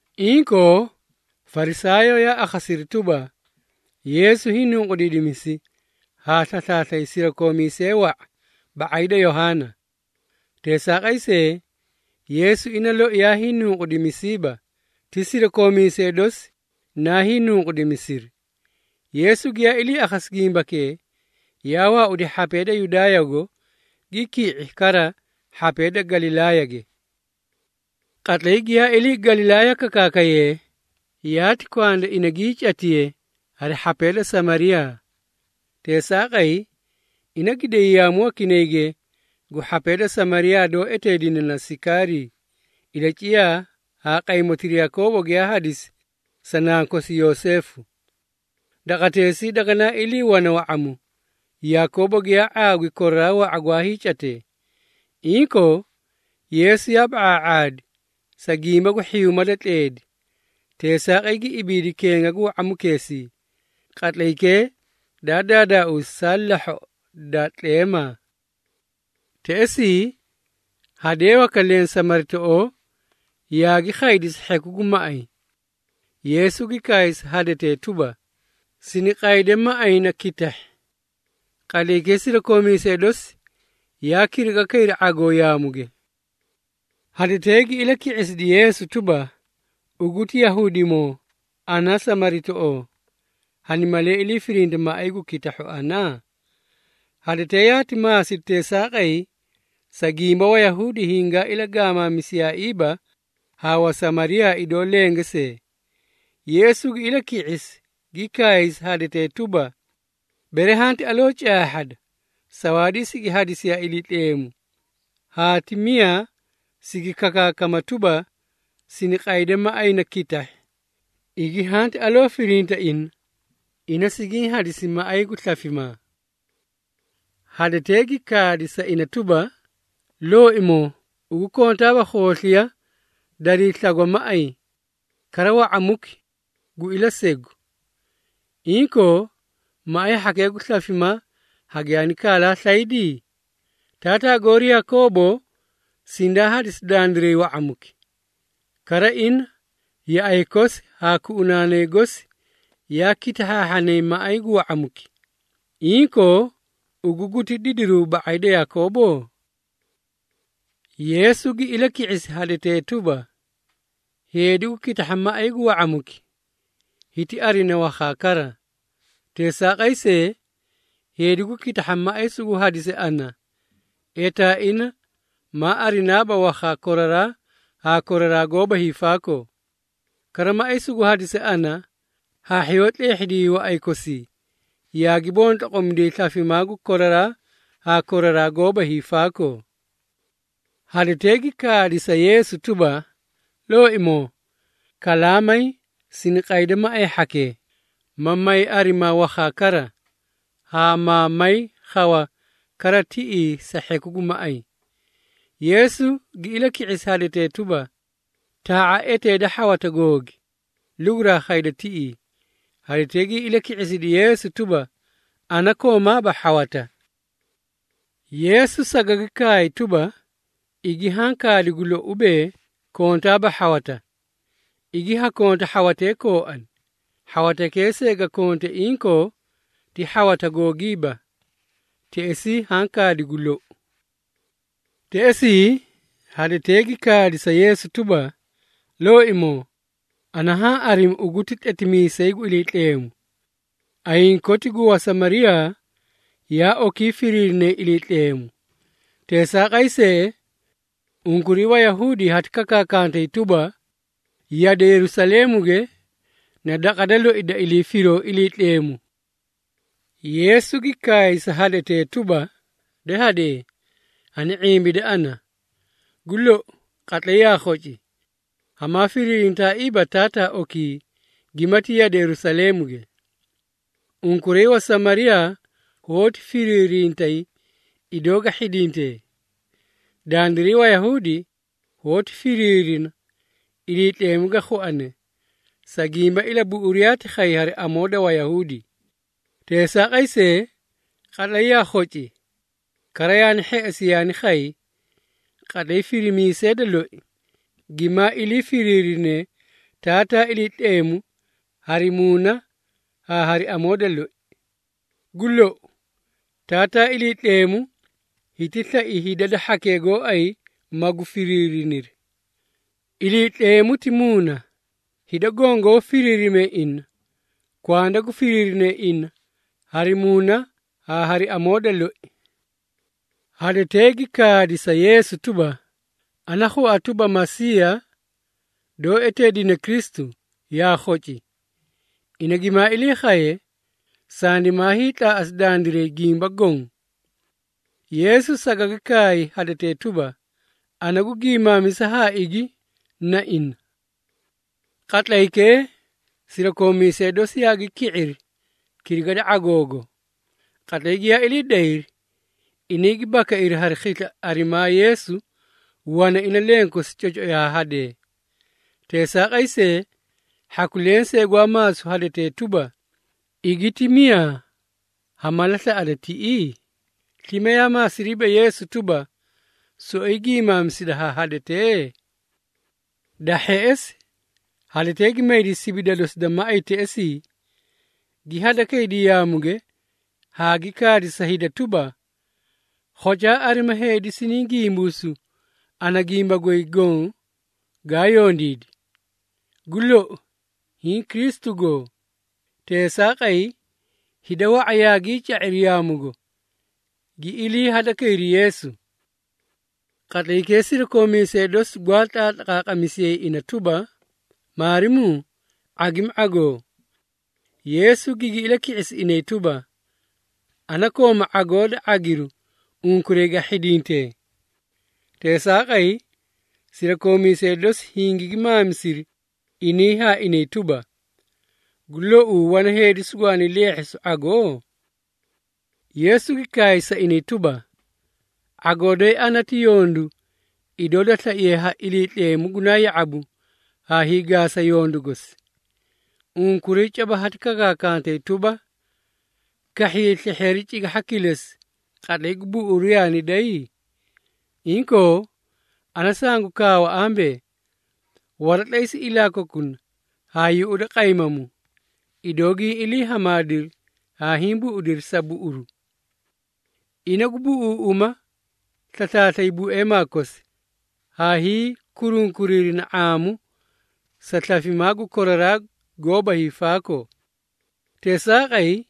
Inkoo, Farisaayoo yaa akhasiri tuba, Yeesu hiinunqudiidimisi haa slaslaaslay sirakoomiisee wa⁄a ba⁄ay da Yohaana. Teesaaqay see, Yeesu ina loi yaa hiinunqudimisiiba, ti sirakoomiisee dosi naa hiinunqudimisiri. Yeesu giyaa ilii akhasi gimbakee, yaa waaudi hhapee da Yudaayago, gi ki⁄i kara hhapee da Galilaayage. Qatlay giyaa ilii Galilaaya kakaakayee, yaati kwanda ina gii catiye hari hhapee da Samariyaa. Teesaaqay, ina gi day yaamu wakinayge gu hhapee da Samariyaa doó eteedine na Sikaarii, ilaciyaa haa qaymotira Yakoobo giyaa hadisi sa nankosi Yoseefu. Daqateesii daganaa ilii wana wa⁄amu, Yakoobo giyaa ⁄aagwi koraraa wa⁄a gwaa hiicatee. Inkoo, Yeesu yaa ba⁄aa⁄aadi, sa gimba gu hhiyuuma da tleedi, teesaaqay gi ibiidi kenga gu wa⁄amukeesii. Qatlaykee daa daadaausi saa lahhoꞌo da tleemaa. Teꞌesii, hadee waka leẽ Samaritoꞌoo yaagi khaydi sa hheku gu maꞌay. Yeesu gi kaay sa hadetee tuba, “Siniqayde maꞌay na kitahhi.” Qatlaykee sirakoomiisee dosi yaa kiriga kayri ⁄agoo yaamuge. Hadetee gi ilaki⁄isidi Yeesu tuba, “Ugu ti Yahuudimoo ana Samaritoꞌoo. Hani malee iliifirinta maꞌay gu kitahhu ana?” Hadetee yaati maasidi teesaaqay, sa gimba Wayahuudi hingaa ilagaamaamisiyaaiiba haa Wasamariyaa idoo lenge see. Yeesu gi ilaki⁄isi, gi kaay sa hadetee tuba, “Bere hanti caahhada, sawaadii sigi hadisiye ha Iliitleemu, haa ti miyaa sigi kakaakama tuba, siniqayde maꞌay na kitahhi, igi hanti aloo firinta ina, ina sigiĩ hadisi maꞌay gu slafimaa.” Hadetee gi kaadi sa ina tuba, “Looimoo, ugu kontaaba khoosliya darii slagwa maꞌay, kara wa⁄amuki gu ilasegu. Inkoo, maꞌay hhakee gu slafimaa hagiyaani kaalaa slaydi? Taataa goori Yakoobo sindaa hadisi dandiray wa⁄amuki. Kara ina, yaꞌay kosi haa kuꞌunaanay gosi yaa kitahhaahhanay maꞌay gu wa⁄amuki. Inkoo, ugu guti didiruu ba⁄ay da Yakoobo?” Yeesu gi ilaki⁄isi hadetee tuba, “Heedi gu kitahha maꞌay gu wa⁄amuki, hiti arina wakhaa kara. Teesaaqay see, heedi gu kitahha maꞌay sugu hadise ana, etaa ina maa arinaaba wakhaa koraraa haa koraraa goóba hiifaakoo. Kara maꞌay sugu hadise ana, hhaahhiyoo tleehhidiyay waꞌay kosii, yaagi bontlogomidiyay slafimaa gu koraraa haa koraraa goóba hiifaakoo.” Hadetee gi kaadi sa Yeesu tuba, “Looimoo, kalaamay sini qayde maꞌay hhakee, ma may arimaa wakhaa kara, haa maa may khawa kara tiꞌii sa hheku gu maꞌay.” Yeesu gi ilaki⁄isi hadetee tuba, “Taa⁄a eteeda hhawata googi, luguraa khayda tiꞌii.” Hadetee gi ilaki⁄isidi Yeesu tuba, “Ana koomaaba hhawata.” Yeesu sagagi kaay tuba, “Igi haã kaadi gu lou ubee, kontaaba hhawata. Igi haa konta hhawatee kooani, hhawatakee see ga konte inkoo ti hhawata googiiba. Teꞌesii haã kaadi gu lou.” Teꞌesii, hadetee gi kaadi sa Yeesu tuba, “Looimoo, ana haã arimi ugu ti tletimiisay gu Iliitleemu. Ayiĩ koti gu Wasamariyaa yaa okii firiirinay Iliitleemu. Teesaaqay see, unkuray Wayahuudi hati kakaakantay tuba, yade Yerusaleemuge na daqa da loi da ilii firoo Iliitleemu.” Yeesu gi kaay sa hadetee tuba, “De hadee, hani⁄imbide ana. Gu lou, qatlay yaa khoci, hamaa firiirintaaiiba Taataa okii gimati yade Yerusaleemuge. Unkuray Wasamariyaa hoóti firiirintay idoo ga hhidintee. Dandiray Wayahuudi hoóti firiirina Iliitleemu ga khuane, sa gimba ilabuꞌuru yaati khay hari amoo da Wayahuudi. Teesaaqay see, qatlay yaa khoci, kara yaani hheꞌesi yaani khay, qatlay firimiisee da loi, gimaa ilii firiirinee Taataa Iliitleemu hari muuna haa hari amoo da loi. Gu lou, Taataa Iliitleemu hiti slai hida da hhakee gooay magu firiiriniri. Iliitleemu ti Muuna, hida goõ goó firiirimee ina, kwanda gu firiirinee ina hari muuna haa hari amoo da loi.” Hadetee gi kaadi sa Yeesu tuba, “Ana khua tuba Masiiya, doó eteedine Kristu, yaa khoci. Ina gimaa ilii khaye, sandimaa hiitlaaꞌasi dandiray gimba goõ.” Yeesu sagagi kaay hadetee tuba, “Ana gu giimaamisa haa igi, na ina.” Qatlaykee, sirakoomiisee dosi yaagi ki⁄iri, kiriga da ⁄agoogo. Qatlay giyaa ilii dayri, inay gi bakairi hari khisla arimaa Yeesu wana ina lenkosi, cocoi haa hadee. Teesaaqay see, hhaku lensee gwaa maasu hadetee tuba, “Igi ti miyaa ha mala slaꞌada tiꞌii?” Slime yaa maasiriiba Yeesu tuba, “Soꞌoyi giimaamisida haa hadetee?” Da hheꞌesi, hadetee gi maydi sibida dosi da maꞌay teꞌesii, gi hadakaydi yaamuge haa gi kaadi sa hida tuba, “Khocaa arima heedi siniĩ gimbuusu ana gimba goy goõ gaa yondiidi! Gu lou, hiĩ Kristu goo?” Teesaaqay, hida wa⁄a yaagii ca⁄iri yaamugo, gi ilii hadakayri Yeesu. Qatlaykee sirakoomiisee dosi gwaa tlaatlaqaaqamisiyay ina tuba, “Maarimuu, ⁄agimi ⁄agoo.” Yeesu gigi ilaki⁄isi inay tuba, “Ana kooma ⁄agoo da ⁄agiru unkuray ga hhindintee.” Teesaaqay, sirakoomiisee dosi hingigi maamisiri inay haa inay tuba, “Gu louu wana heedi sugwaani leehhisu ⁄agoo?” Yeesu gi kaay sa inay tuba, “⁄agoo doyi ana ti yondu idoo da slaiye ha Iliitleemu gunaa ya⁄abu haa hiigaasa yondu gosi. Unkuray caba hati kakaakantay tuba, ‘Kahhiyay slehheeri cigahha kilesi, qatlay gu buꞌuru yaani day?’ Inkoo, ana sangu kaawa ambee, waratlaysa ilaa kokuna haa yuꞌuda qaymamu, idoo giĩ ilii hamaadiri haa hiĩ buꞌudiri sa buꞌuru! Ina gu buꞌuuꞌuma slaslaaslay bueemaa kosi, haa hiikurunkuriirina ⁄aamu sa slafimaa gu koraraa goóba hiifaakoo. Teesaaqay,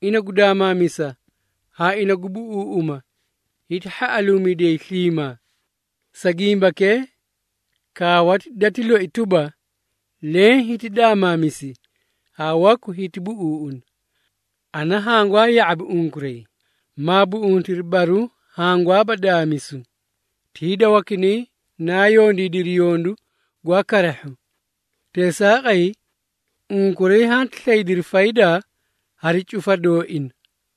ina gu daamaamisa haa ina gu buꞌuuꞌuma, hiti hhaꞌaluumidiyay sliimaa. Sa gimbakee, kaawati dati loi tuba, ‘Leẽ hiti daamaamisi haa waku hiti buꞌuuꞌuna.’ Ana hangwaa ya⁄abi unkuray, maa buꞌuntiri baruũ hangwaaba daamisu, ti hida wakinay naa yondiidiri yondu gwaa karahhu. Teesaaqay, unkuray hanti slaydiri faydaa hari cufa dooina.”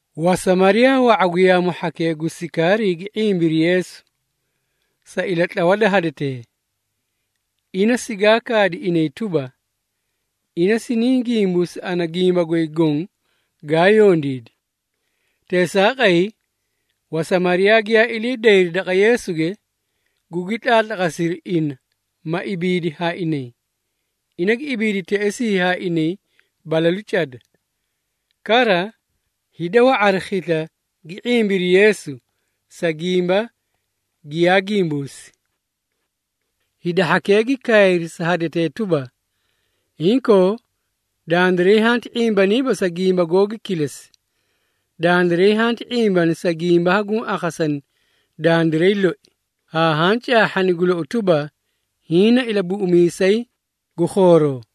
Wasamariyaa wa⁄a gu yaamu hhakee gu Sikaarii gi ⁄imbiri Yeesu, sa ilatlawa da hadetee. Ina sigaa kaadi inay tuba, “Ina siniĩ gimbuusi ana gimba goy goõ gaa yondiidi!” Teesaaqay, Wasamariyaa giyaa ilii dayri daqa Yeesuge, gugi tlaatlaqasiri ina ma ibiidi haa inay. Ina gi ibiidi teꞌesii haa inay balalu cada. Kara, hida wa⁄a hari khisla gi ⁄imbiri Yeesu, sa gimba giyaa gimbuusi. Hida hhakee gi kaayri sa hadetee tuba, “Inkoo, dandiray hanti ⁄imbaniiba sa gimbaa googi kilesi. Dandiray hanti ⁄imbani sa gimba haguũ akhasani dandiray loi, haa haã caahhani gu lou tuba, hiĩ na Ilabuꞌumiisay gu khooroo.”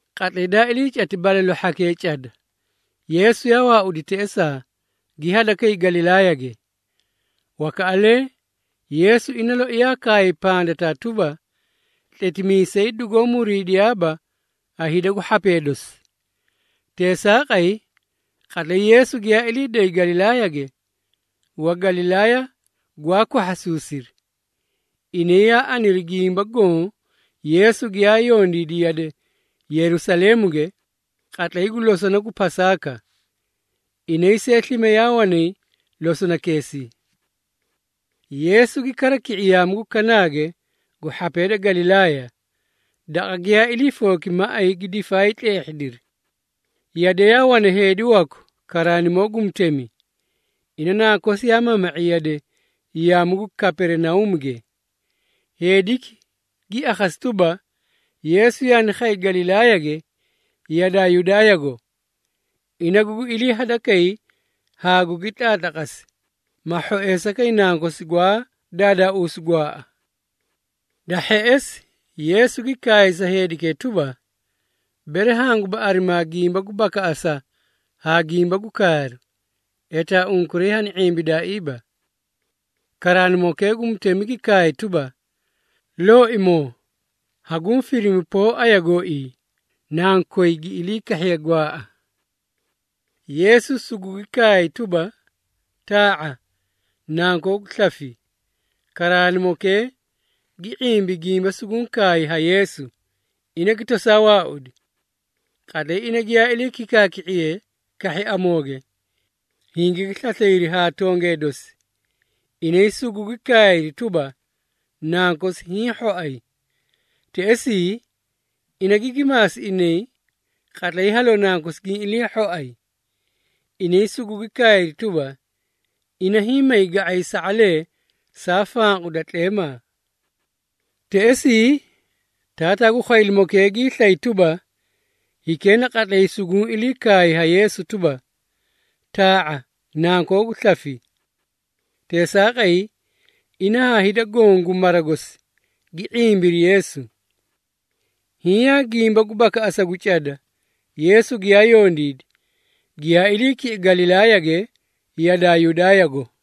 Qatlay daa ilii cati balalu hhakee cada, Yeesu yaa waaudi teꞌesaa, gi hadakay Galilaayage. Wakaꞌalee, Yeesu ina loi yaa kaay pandataa tuba, “Tletimiisay dugoó muriidiyaaba ha hida gu hhapee dosi.” Teesaaqay, qatlay Yeesu giyaa ilii day Galilaayage, Wagalilaaya gwaa kwahhasuusiri. Inay yaa aniri gimba goõ Yeesu giyaa yondiidi yade Yerusaleemuge qatlay gu losona gu Pasaaka. Inay see slime yaa wanay losonakeesii. Yeesu gi kara ki⁄i yaamu gu Kanaage gu hhapee da Galilaaya, daqa giyaa ilii fooki maꞌay gi difaay tleehhidiri. Yade yaa wana heedi waku karaanimoo gu mutemi. Ina nankosi yaa mama⁄i yade yaamu gu Kaperinauumuge. Heediki gi akhasi tuba, Yeesu yaani khay Galilaayage yadaa Yudaayago. Ina gugi ilii hadakay haa gugi tlaatlaqasi, ma hhoeesa kay nankosi gwaa daadaauusu gwaaꞌa. Da hheꞌesi, Yeesu gi kaay sa heedikee tuba, “Bere hanguba arimaa gimba gu bakaꞌasa haa gimba gu kaaru, etaa unkuray hani ⁄imbidaaiiba.” Karaanimokee gu mutemi gi kaay tuba, “Looimoo, hanguũ firimi poo aya gooii nankoy gi ilii kahhiye gwaaꞌa.” Yeesu sugugi kaay tuba, “Taa⁄a, nankoogu slafi.” Karaanimokee gi ⁄imbi gimba suguũ kaay ha Yeesu, ina gi tosaa waaudi. Qatlay ina giyaa ilii kikaaki⁄iye kahhi amooge, hingigi slaslayri haa tongee dosi, inay sugugi kaayri tuba, nankosi hiĩ hhoay. Teꞌesii, ina gigi maasi inay qatlay haloo nankosi giĩ ilii hhoay. Inay sugugi kaayri tuba, “Ina hiĩ may ga⁄ay sa⁄alee saa fanqu da tleemaa.” Teꞌesii, taataa gu khwaylimokee giislay tuba, hikee na qatlaykira suguũ ilii kaay ha Yeesu tuba, “Taa⁄a, nankoogu slafi.” Teesaaqay, ina haa hida goõ gu mara gosi gi ⁄imbiri Yeesu. Hiĩ yaa gimba gu bakaꞌasa gu cada Yeesu giyaa yondiidi, giyaa ilii ki⁄i Galilaayage yadaa Yudaayago.